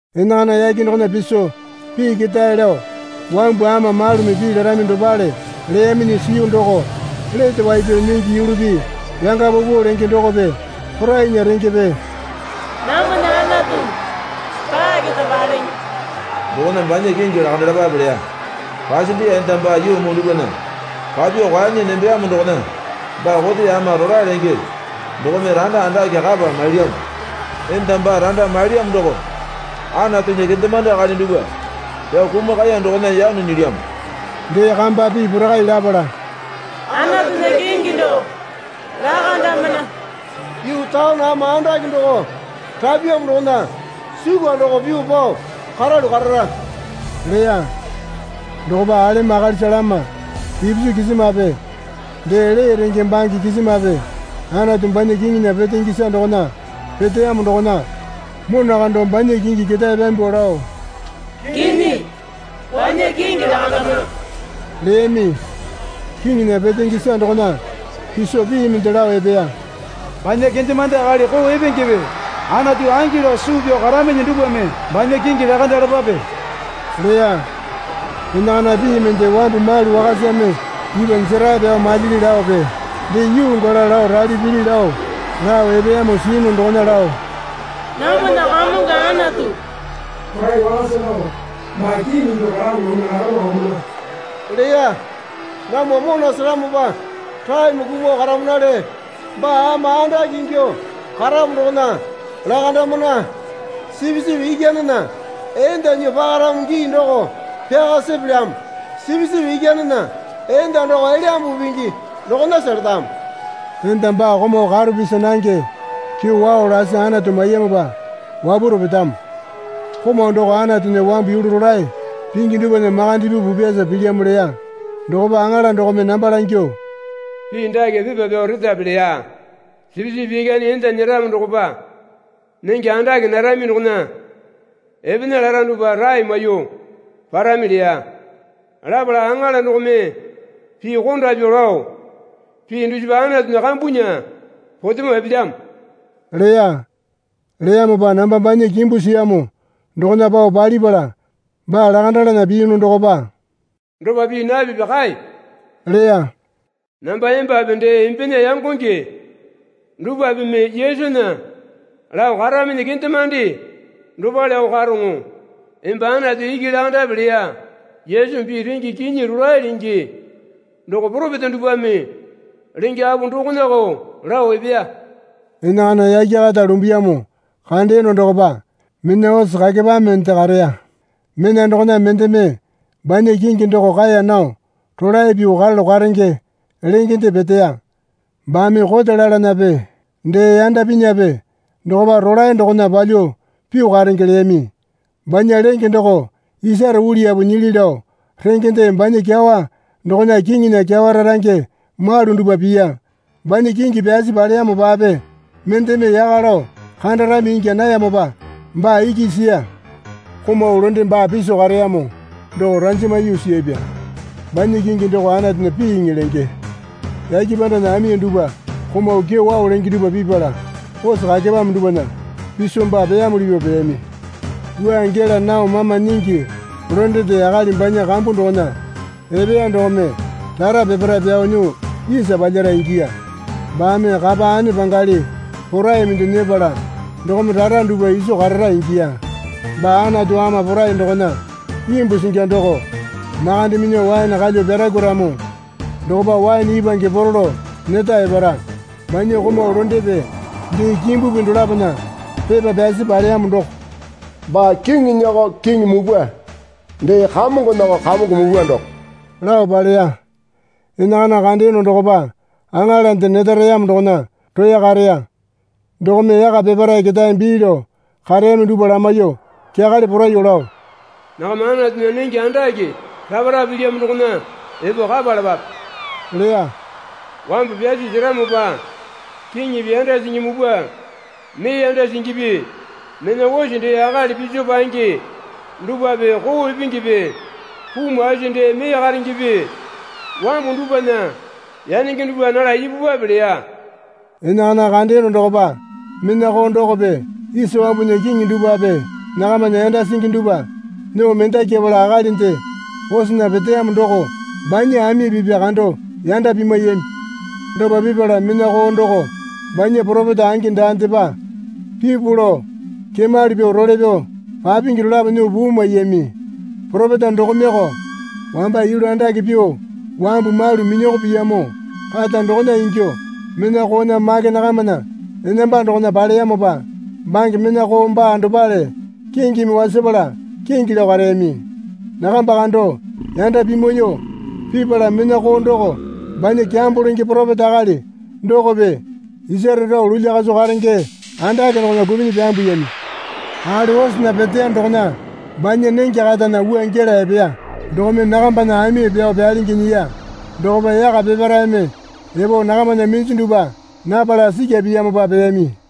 Enakana yake dokona piso pii ketae lao wambu ama malumi pii larami dopale leyaminyi siyu doko, Lete wai pyao nyingi yulupi yanga paupau lenge dokope porainya rengepe namwana Anatu baa keta palenge. Dokona banya kingi lakandalapape leya. Pasendiya enda baa yuu muu dupwana papyuo kwuanyi nembeyamo dokona baa kote ama rolae lenge dokome randa andake kapa mailyamo. Enda baa randa mailyamo doko Anatunya kendemande akali dupwa pyao kumakaya dokona yano nyilyamo. Dee kamba pii porakai lapala, Anatunya kingi doko lakandamana. Yuu taone ama andake doko rapyamo dokona sukwa doko pyuo pao karalu karara leya. Dokopa alemo akalisa lama ipisu kisimape dee lee renge bange kisimape Anatu banya kiŋinya petenge isa dokona peteyamo dokona mona kando banya kingi ketae pyambuo lao, Kinyi banya kingi lakandamana leyami. Kiŋinya petenge isa dokona piso pii mende lao epeya. Banya kendemande akali koo epengepe Anatu angi lao suu pyao karaminyi dupwame banya kingi lakandalapape leya. Enakana pii mende wambu malu wakasame ipwa jerae pyao malyili laope dee yuu gala lao rali pili lao lao epeyamo siyunu dokona lao, Namwana Kamongo Anatu Porai Wakasa doko baa kiŋi ingyuo karamo dokona lakando karamana leya. Namwa mona seramopa raeme kumuo karamanale. Baa ama andake ingyuo karamo dokona lakandamana. Sipisipi Ikyanena enda nyuo pakaramo gii doko pyaka sepelyamo. (Sipisipi Ikyanena enda doko Elyambu Pingi dokonasa letamo.) Enda baa komau karo pisi nange kyewao lasi Anatu maiyamopa wapwaro petamo. (Komau doko Anatunya wambu yulu rolae pingi dupwana makande pyuo pupyasa pilyamo leya.) Dokopa aŋala dokome namba langyuo, Pii dake pepa pyao retape leya. Sipisipi Ikyane enda nyeramo dokopa nenge andake narami dokona epena lara dupwa rae maiyuo parami leya. Lapala aŋala dokome pii konda pyuo lao, Pii dusipa Anatunya kambunya potemo epelyamo leya. Leyamopa namba banya kimbu siyamo dokona pao palipala baa lakandalana piyunu dokopa, Dopa pii napipi kae leya. Namba embape dee embena yangonge dupwapeme Yesunya lao karaminyi kendemande dopaleko karoŋo. Emba Anatu iki lakandape leya. Yesumi pii renge kinyi rolae lenge doko poropeta dupwame lenge apo dokonako lao epeya. Enakana yake kata lumbuyamo kandeyono dokopa mena ose kakepamende kareya. Mena dokona mendeme banya kingi doko Kaeya Nao Rolae Pyuo Karalu Karenge lengende peteya. Baame kote lalanape dee yanda pinyape dokopa rolae dokona palyuo pyuo karenge leyami. Banya lenge doko isare uliyapu nyili lao rengende banya kyawa dokona kiŋinya kyawa rarange malu dupwa piya. Banya kingi pyasi paleyamopape mendeme yaka lao kandarami ingya nayamopa baa iki siya. Komau londe baa piso kareyamo doko ranjama yuu siyapya. Banya kingi doko Anatunya Piiŋi lenge. Yake pandana ami dupwa komau kyewao lenge dupwa pipala ose kakepame dupwana piso baa peyamuli pyuo peyami. Wua gela nao mama nyingi londende akali banya kambu dokona epeya dokome rara peparae pyao nyuo isa palyara ingiya. Baame kapa ane pangali porai mende nyepala dokome rara dupwa iso karara ingiya. Baa Anatu Ama Porai dokona imbu singi doko makande minyuo waene kalyuo pyarakwuaramo dokopa waene ipwange poro lao neta epara. Banya komau londepe dee kimbupi dolapona pepa pyasi paleyamo doko, Baa kiŋinyako Kiŋi mupwa dee kamongonako Kamongo mupwa doko lao paleya. Enakana kandeyono dokopa aŋalande neta reyamo dokona roya kareya. Dokome yaka peparae ketae bii lao kareyami dupwa lamaiyuo kyakale poraiyuo lao, Nakama Anatunya nenge andake rapa rapa pilyamo dokona epo kapalapape leya. Wambu pyasi seramopa kiŋipi yanda singi mupwa mee yanda singipi mena ose dee akali piso paenge dupwape koo epengepe puu maisi dee mee karengepe wambu dupwana yanenge dupwa nala ipupwape leya. Enakana kandeyono dokopa mena koo dokope isa wambunya kiŋi dupwape nakamana yanda singi dupwa nyuo mendakyapala akalinde osena peteyamo doko banya ami pipa kando yanda pimwaiyami. Dopa pipala mena koo doko banya poropeta angi daandepa pipu lao kemali pyuo role pyao papingi dolapo nyuo puu maiyami. (Poropeta dokomeyoko wamba yulu andake pyuo wambu malu minyoko piyamo kata dokona ingyuo mena koona make nakamana enamba dokona paleyamopa bange mena koo baa dopale kingimi wasapala kingi lao kareyami.) Nakamba kando yanda pimwaiyuo pipala mena koo doko banya kyambo lenge poropeta akali dokope isare rao lulya kaso karenge andake dokona kupinyi pyambuyami. Akali osena peteya dokona banya nenge katana wua gela epeya dokome nakambana ami pyao pyalingi nyiya. Dokopa yaka peparaeme epo nakamana minju dupwa napala sikya piyamopa peyami.